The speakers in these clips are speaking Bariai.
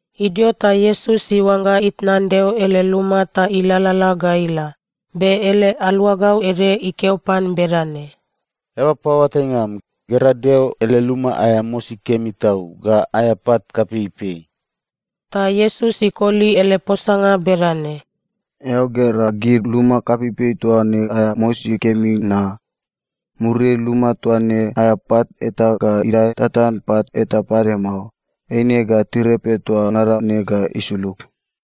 Idio ta Iesus iuangga itnan Deo ele luma ta ilalala ga ila, be ele aluagau ede ikeo pan bedane, “Eaba paoatainga am, gera Deo ele luma aea mosi kemi tau ga aea pat kapeipei!” Ta Iesus ikoli ele posanga bedane, “Eao gera gid luma kapeipei toa ne aea mosi kemi na? Muriai luma toa ne aea pat eta ga idae tatan pat eta pade mao. Eine ga tirepe toa ngada ne ga isulug.”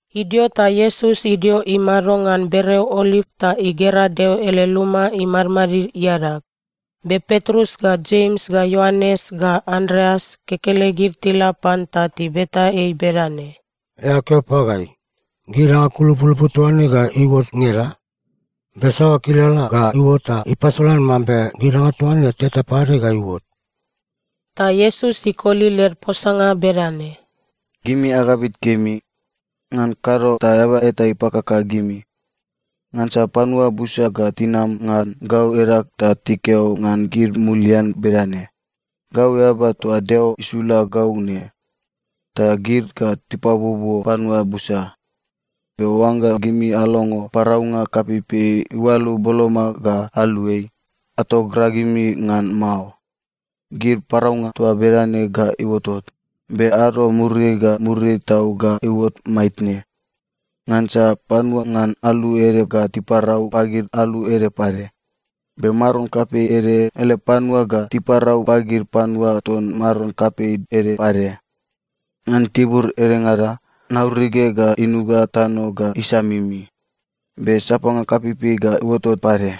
Idio ta Iesus idio imado ngan bereo Oliv ta igera Deo ele luma imadmadid iadag. Be Petrus ga Jems ga Ioanes ga Andreas kekelegid tila pan ta tibeta ei bedane, “Eao keo pagai, gid danga kulupulupu toa ne ga iuot ngeda? Be saoa kilala ga iuot ta ipasolan mambe gid danga toa ne teta pade ga iuot?” Ta Iesus ikoli led posanga bedane, “Gimi agabit kemi. Ngan kado ta eaba eta ipakaka gimi. Ngansa panua busa ga tinam ngan gau edag ta tikeo ngan gid mulian bedane, ‘Gau eaba toa Deo isula gau ne.’ Ta gid ga tipabuobuo panua busa. Be oangga gimi alongo paraunga kapeipei iualu boloma ga aluai, atogragimi ngan mao. Gid paraunga toa bedane ga iuotot, be ado muriai ga muriai tau ga iuot maitne. Ngansa panua ngan alu ede ga tiparau pagid alu ede pade, be maron kapei ede ele panua ga tiparau pagid panua ton maron kapei ede pade. Ngan tibur edengada nauruge ga inuga tano ga isamimi. Be sapanga kapeipei ga iuotot pade.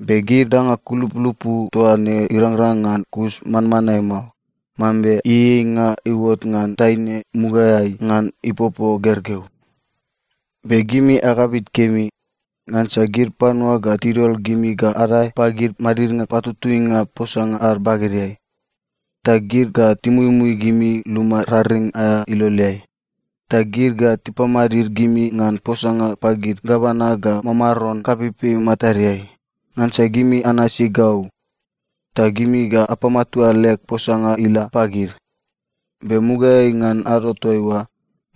Be gid danga kulupulupu toa ne irangrang ngan kus manmanae mao, mambe ieieinga iuot ngan taine mugaeai ngan ipopo gergeu. “Be gimi agabit kemi. Ngansa gid panua ga tidol gimi ga adae pagid madidnga patutuinga posanga ad bagedeai. Ta gid ga timuimui gimi luma raring aea iloleai. Ta gid ga tipamadid gimi ngan posanga pagid gavana ga mamaron kapeipei matadeai, ngansa gimi anasi gau. Ta gimi ga apamatua leg posanga ila pagid. Be mugaeai ngan ado toaiua,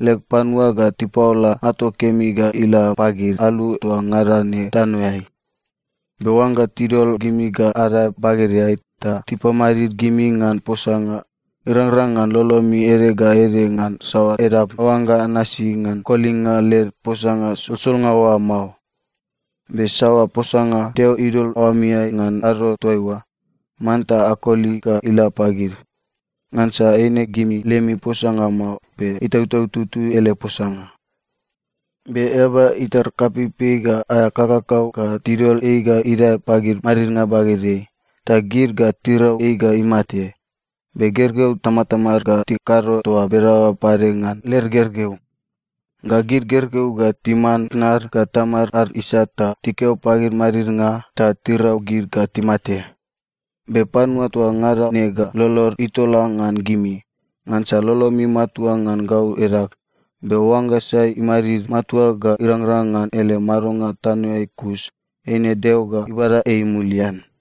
leg panua ga tipaola ato kemi ga ila pagid alu toa ngada ne tanoeai. Be oangga tidol gimi ga adae bagedeai ta tipamadid gimi ngan posanga, irangrang ngan lolomi ede ga ede ngan saoa edap aoangga anasi ngan kolinga led posanga solsolnga oa mao. Be saoa posanga Deo idol aoamiai ngan ado toaiua, manta akoli ga ila pagid. Ngansa eine gimi lemi posanga mao, be Itautau Tutui ele posanga. “Be eaba itar kapeipei ga aea kakakau ga tidol ei ga idae pagid madidnga bagedeai, ta gid ga tirau ei ga imate. Be gergeu tamatamad ga tikado toa bedaoa pade ngan led gergeu. Ga gid gergeu ga timan tnad ga tamad ad isat ta tikeo pagid madidnga ta tirau gid ga timate. Be panua toa ngada ne ga lolod itola ngan gimi, ngansa lolomi matua ngan gau edag. Be oangga sai imadid matua ga irangrang ngan ele madonga tanoeai kus, eine Deo ga ibada ei mulian.”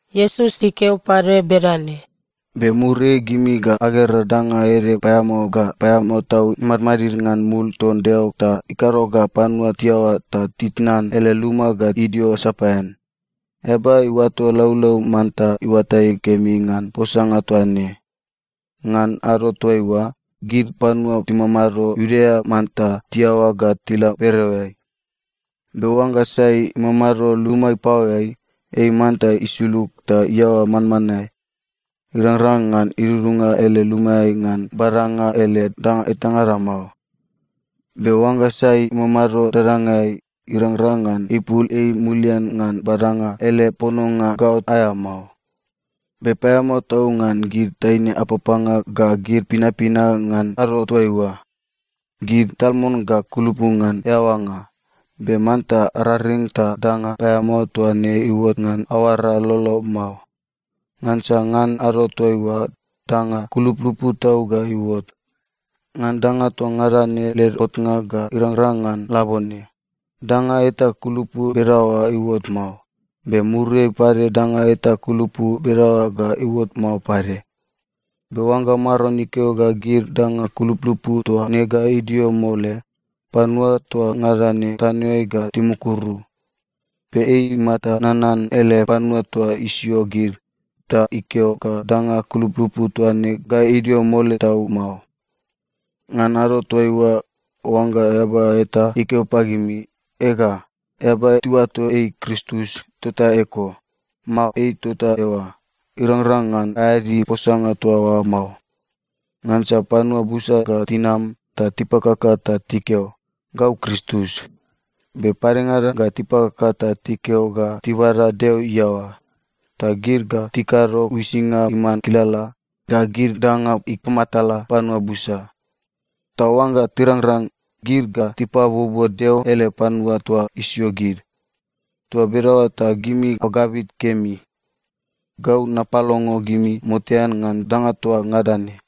Iesus ikeo pade bedane, “Be muriai gimi ga agera danga ede paeamao ga paeamao tau imadmadid ngan mul ton Deo ta ikado ga panua tiaoa ta titnan ele luma ga idio sapaean. (Eaba iuato laulau manta iuatai kemi ngan posanga toa ne.) Ngan ado toaiua, gid panua timamado Iudea manta tiaoa ga tila bereoeai. Be oangga sai imamado luma ipaoeai, ei manta isulug ta iaoa manmanae. Irangrang ngan idudunga ele lumaeai ngan badanga ele danga etangada mao. Be oangga sai imamado dadangai, irangrang ngan ipul ei mulian ngan badanga ele pononga gaot aea mao. Be paeamao tau ngan gid taine apapanga ga gid pinapina ngan ado toaiua. Gid tal mon ga kulupu ngan eaoanga. Be manta araring ta danga paeamao toa ne iuot ngan aoara lolo mao. Ngansa ngan ado toaiua, danga kulupulupu tau ga iuot. Ngan danga toa ngada ne led otnga ga irangrang ngan labone, danga eta kulupu bedaoa iuot mao, be muriai pade danga eta kulupu bedaoa ga iuot mao pade. Be oangga Maron ikeo ga gid danga kulupulupu toa ne ga idio mole, panua toa ngada ne tanoeai ga timukuru. Be ei imata nanan ele panua toa isio gid, ta ikeo ga danga kulupulupu toa ne ga idio mole tau mao. Ngan ado toaiua, oangga eaba eta ikeo pagimi, ‘Ega, eaba tiuato ei Kristus tota eko!’ mao ‘Ei tota eoa!’ irangrang ngan aeadi posanga toa oa mao. Ngansa panua busa ga tinam ta tipakaka ta tikeo, ‘Gau Kristus.’ Be padengada ga tipakaka ta tikeo ga tibada Deo iaoa. Ta gid ga tikado uisinga iman kilala ga gid danga ipamatala panua busa. Ta oangga tirangrang, gid ga tipabuobuo Deo ele panua toa isio gid. Toa bedaoa ta gimi agabit kemi. Gau napalongo gimi motean ngan danga toa ngada ne.”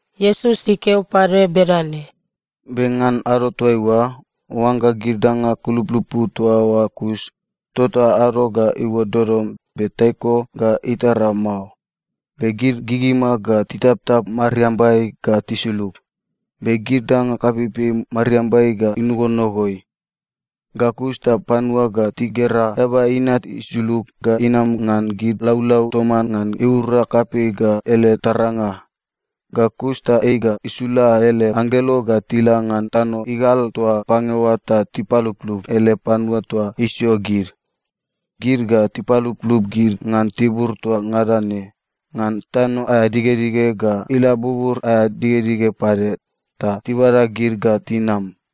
Iesus ikeo pade bedane, “Be ngan ado toaiua, oangga gid danga kulupulupu toa oa kus, tota “‘ado ga iuot dodom, be taiko ga itara mao, be gid gigima ga titaptap mariambai ga tisulug, be gid danga kapeipei mariambai ga inogonogoi.’ “Ga kus ta panua ga tigera Eaba Inat isulug ga inam ngan gid laulau toman ngan iura kapei ga ele taranga. Ga kus ta ei ga isula ele anggelo ga tila ngan tano igal toa pange oa ta tipaluplup ele panua toa isio gid. Gid ga tipaluplup gid ngan tibur toa ngada ne, ngan tano aea digedige ga ila bubur aea digedige pade, ta tibada gid ga tinam.”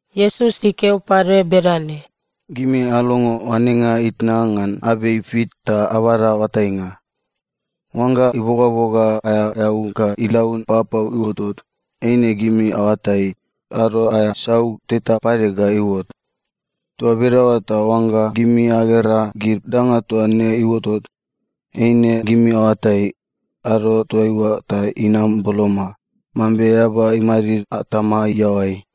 Iesus ikeo pade bedane, “Gimi alongo oanenga itna ngan abei fik ta abada oatainga. Oangga ibogaboga aea eau ga ilaun papau iuotot, eine gimi aoatai, ado aea sau teta pade ga iuot. Toa bedaoa ta oangga gimi agera gid danga toa ne iuotot, eine gimi aoatai, ado toaiua ta inam boloma, mambe eaba imadid atama iaoai.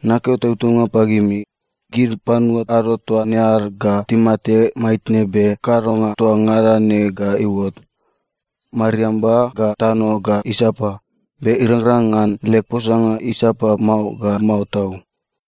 Nakeo tautaunga pagimi, gid panua ado toa ne ad ga timate maitne be kadonga toa ngada ne ga iuot. Mariamba ga tano ga isapa, be irangrang ngan leg posanga isapa mao ga mao tau.”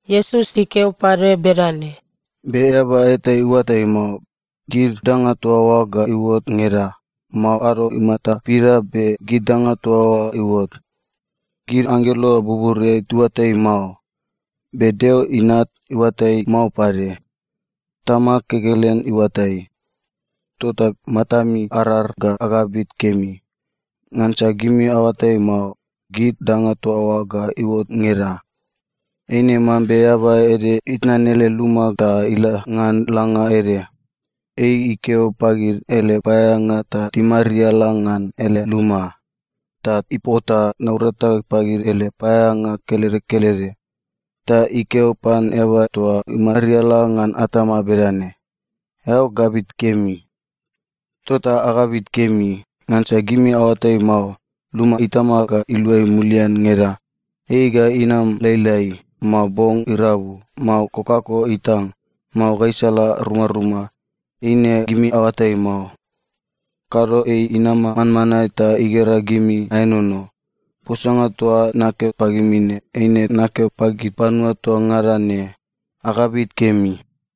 Iesus ikeo pade bedane, “Be eaba eta iuatai mao, gid danga toa oa ga iuot ngeda, mao ado imata pida be gid danga toa oa iuot. Gid anggelo buburiai tiuatai mao, be Deo Inat iuatai mao pade. Tamag kekelen iuatai. Tota matami arar ga agabit kemi. Ngansa gimi aoatai mao, gid danga toa oa ga iuot ngeda. Eine mambe eaba ede itnan ele luma ta ila ngan langa ede. Ei ikeo pagid ele paeaeanga ta timariala ngan ele luma, ta ipota naurata pagid ele paeaeanga kelede kelede. Ta ikeo pan eaba toa imariala ngan atama bedane, ‘Eao gabit kemi.’ “Tota agabit kemi, ngansa gimi aoatai mao, luma itama ga iluai mulian ngeda. Ei ga inam lailai, mao bong irabu, mao kokako itang, mao gaisala rumaruma, eine gimi aoatai mao. Kado ei inama manmanae ta igera gimi aenono. Posanga toa nakeo pagimi ne, eine nakeo pagid panua toa ngada ne: ‘Agabit kemi!’”